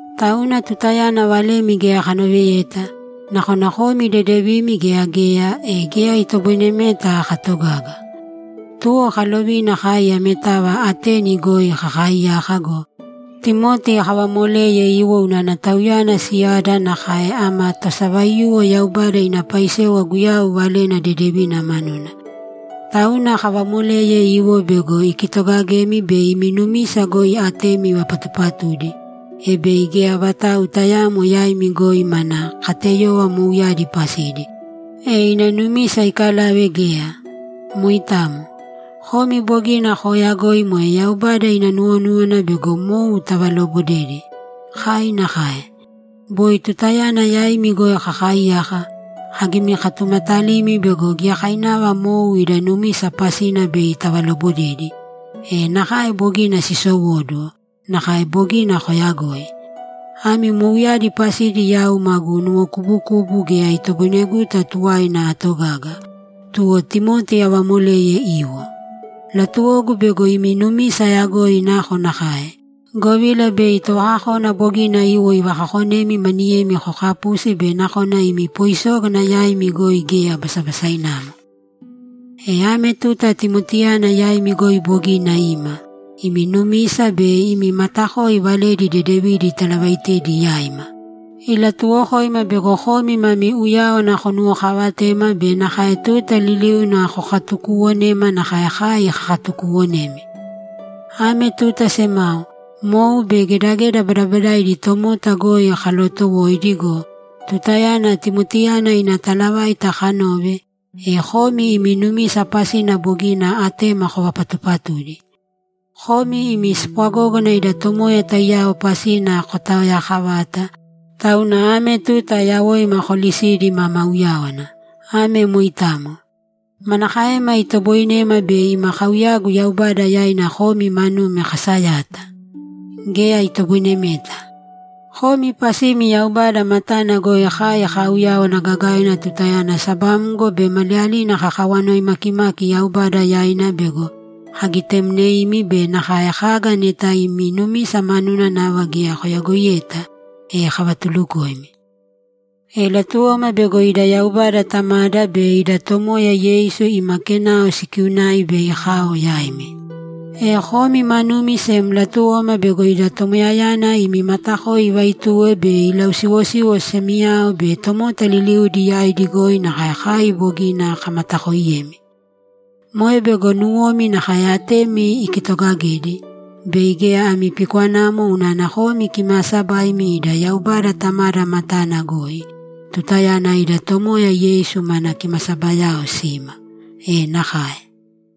Tauna tutayana valemi geya kanoveta, nakona komi dedevimi gea geya, e geya itoboinemeta katogaga. Tuwo kalovina kai ametava Ateni goi kakaaiyaka go, Timoti kavamoleye iwo unana tauyana siyada nakae ama tosavaiyuwo Yaubada ina paisewa Guyau Valena Dedevina manuna. Tauna kavamoleye iwo bego ikitogagemi be imi numisa goi atemi ivapatupatudi, e bei geya vatau tayaamo yaimi goi mana kateyova mouyadi pasidi, e ina numisa ikalave geya. Moitamo. Komi bogina kooyagoi moe Yaubada ina nuwonúwana bego mou tavaloobodedi. Kai nakae. Boi tutayana yaimi goi kakaaiyaka, kagimikatumatalimi bego giyakainava mou ida numisa pasina bei tavalobodedi, e nakae bogina siisowóduwo, nakae bogina kooyagoi. Ami mouyadi pasidi yau magu nuwokubukubu geya itoboineguta tuwaina atogaga, tuwo Timoti avamoleye iwo. Latuwogu bego imi numisa ayagoi nakonakae, govila bei Tovakakona bogina iwo ivakakonemi maniyemi kokapusi be nakona ima poisógana yaimi goi geya basabasainamo. E ame tuta Timotiyana yaimi goi bogina ima, imi numisa be imi matakoi valedi dedevidi italavaitedi yaima. Ilatuwokoima bego komi mami uyáwana konuwokaavatema be nakae tuta liliuna kokatukuuwonema nakae kai kakatukuuwonemi. Ame tuta semao, mou be gedageda badabadaidi tomota goi kalootowoidi go, tutayana Timotiyana ina talavaita kanove, e komi imi numisa pasina bogina atema kovapatupatudi. Komi imi spwagógana ida Tomoya taiyao pasina kotaoyaakavata, tauna ame tuta yawoima koolisidi mama uyáwana. Ame moitamo. Manakaema itoboinema bei ima kauyagu Yaubada yaina komi manumi kasayata? Geya itoboinemeta! Komi pasimi Yaubada matana goi kai kaauyáwana gagaina tutayana sabamgo be maliyalina kakawanoi maakimaki Yaubada yaina bego kagitemneimi be nakae kaga neta imi numisa manuna nava geya koyagoiyeta, e kavatulukoimi. E latuwoma bego ida Yaubada Tamada be ida Tomoya Yeisu ima kenao sikiunai bei kao yaimi. E komi manumi sem latuwoma bego ida Tomoyayana imi matakoi ivaituwe be ilausiwosiwo semiyao be tomota liliudi yaidi goi nakae kai bogina kamatakooiyemi. Moe bego nuwomi nakae atemi ikitogagedi, bei geya ami pikwanamo unana komi kimaasabaimi ida Yaubada Tamada matana goi, tutayana ida Tomoya Yeisu mana kimasabayao sima. [E nakae!]